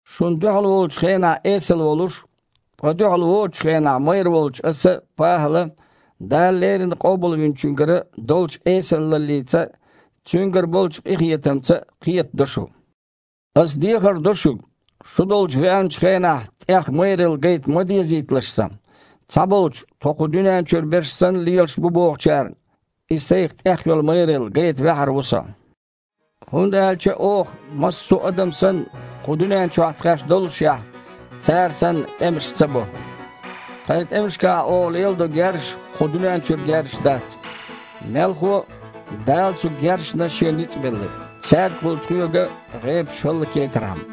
Шуна дуьхьал волчу хенахь эсала волуш, ткъа дуьхьал воцучу хенахь майра волчу аса, ПахІала, Дала леррина Къобалвинчуьнгара долчу эсалаллица а, Цуьнгара болчу къинхетамца а кхетадо шу. Аса дехар до шуьга, шу долчу веанчу хенахь, тІех майралла гайта ма дезийталаш сан. Цхьаболчу, тхо кху дуьнен чуьра берш санна лелаш ду бохучарна, и сайн тІех йолу майралла гайта ваьхьар ву со. ХІунда аьлча оха, массо а адам санна, кху дуьнен чохь тхаьш доллушехь, цара санна, тІемаш ца бо. Тхайн тІемашкахь оха леладо герзаш кху дуьнен чуьра герзаш дац. Мелхо а, Дала цу герзашна Шен ницкъ белла, цаьргахула тхоьга гІепаш хІаллакьяйтархьама.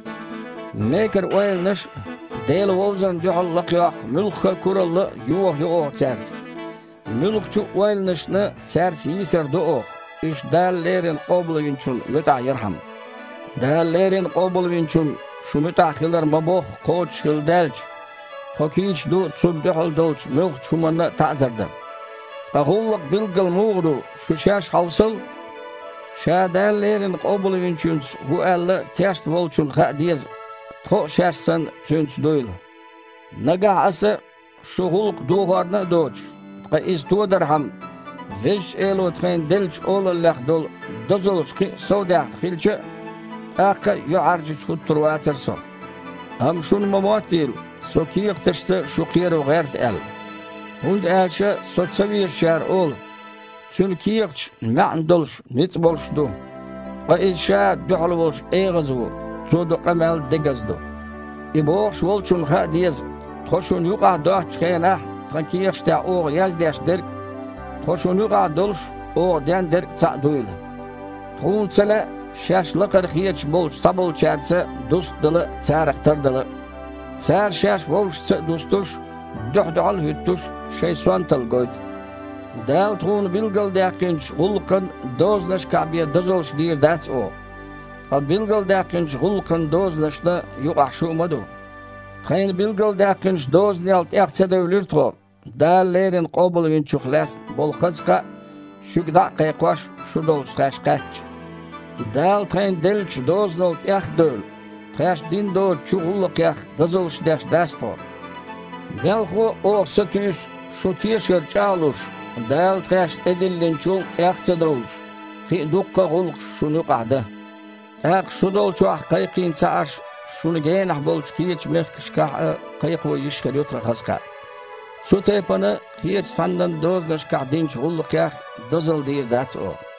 Мекара ойланаш а, Дела вовзарна дуьхьал лакхайоккху муьлхха а куралла а йохайо оха цаьрца. Муьлххачу а ойланашна цаьрца йийсар до оха, уьш Дала леррина Къобалвинчунна муьтІахь ярхьама. Дала леррина Къобалвинчунна шун муьтІахь хилар ма-бохху кхочушхилла даьлча, тхо кийча ду, цунна дуьхьал долчу муьлххачу хІуманна а таІзар дан. Ткъа гІуллакх билггал муха ду, шу-шаьш хьовсал! Ша Дала леррина Къобалвинчуьнца ву аьлла тешна волчунна хаа деза, тхо а шаьш санна, Цуьнца дуйла. Нагахь аса, шун гІуллакх дохорна а доцуш, ткъа иза тодархьама, Везачу Эло тхайна деллачу олаллех долу дозаллаш кхин а совдаьхна хилча а, тІаккха а юьхьІаьржачу хІуттур вацара со. Амма шуна ма моттийла, со кехаташца шу кхеро гІерта аьлла. ХІунда аьлча со цавезачара олу: «Цуьнан кехаташ маьІна долуш, ницкъ болуш ду, ткъа иза ша дуьхьал волуш эгІаза ву, цо до къамел дегаза а ду». И бохуш волчунна хаа деза, тхо шуна юкъахь доцчу хенахь тхайн кехаташ тІехь оха яздеш дерг а, тхо шуна юкъахь долуш оха ден дерг а цхьаъ дуйла. Тхуна ца лаьа шаьш лакхара хеташ болчу цхьаболчаьрца дустадала а, царах тардала а. Цара, шаьш вовшашца а дустуш, дуьхь-дуьхьал а хІуьттуш, шайн сонталла гойту. Дала тхуна билгалдаьккхинчу гІуллакхан дозанашкахь бен дозаллаш дийр дац оха, ткъа билгалдаьккхинчу гІуллакхан дозанашна юкъахь шу ма ду. Тхайна билгалдаьккхинчу дозанел тІех ца девлира тхо, Дала леррина Къобалвинчух лаьцна болу хаза кхаъ шуьга дІа а кхайкхош, шу долчу тхаьш кхаьчча. Дала тхайна деллачу дозанал тІех а девлла, тхаьш дина доцучу гІуллакхех дозаллаш деш дац тхо. Мелхо а, оха сатуьйсу, шун тешар чІагІ а луш, Дала тхаьшна тІедиллинчул тІех а ца довлуш, кхин а дуккха а гІуллакхаш шуна юкъахь дан. ТІаккха шу долчохь кхайкхийна ца Іаш, шуна генахь болчу кхечу мехкашкахь а кхайкхо йиш хир ю тхан хаза кхаъ. Цу тайпана, кхечу цхьаннан дозанашкахь динчу гІуллакхех дозалла дийр дац оха.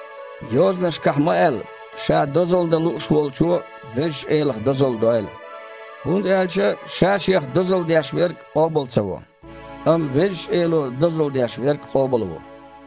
Йозанашкахь ма-аьлла: «Ша дозалла дан лууш волчо – Везачу Элах дозалла дойла». ХІунда аьлча ша-шех дозалла деш верг къобал ца во, амма Везачу Эло дозалла деш верг къобалво.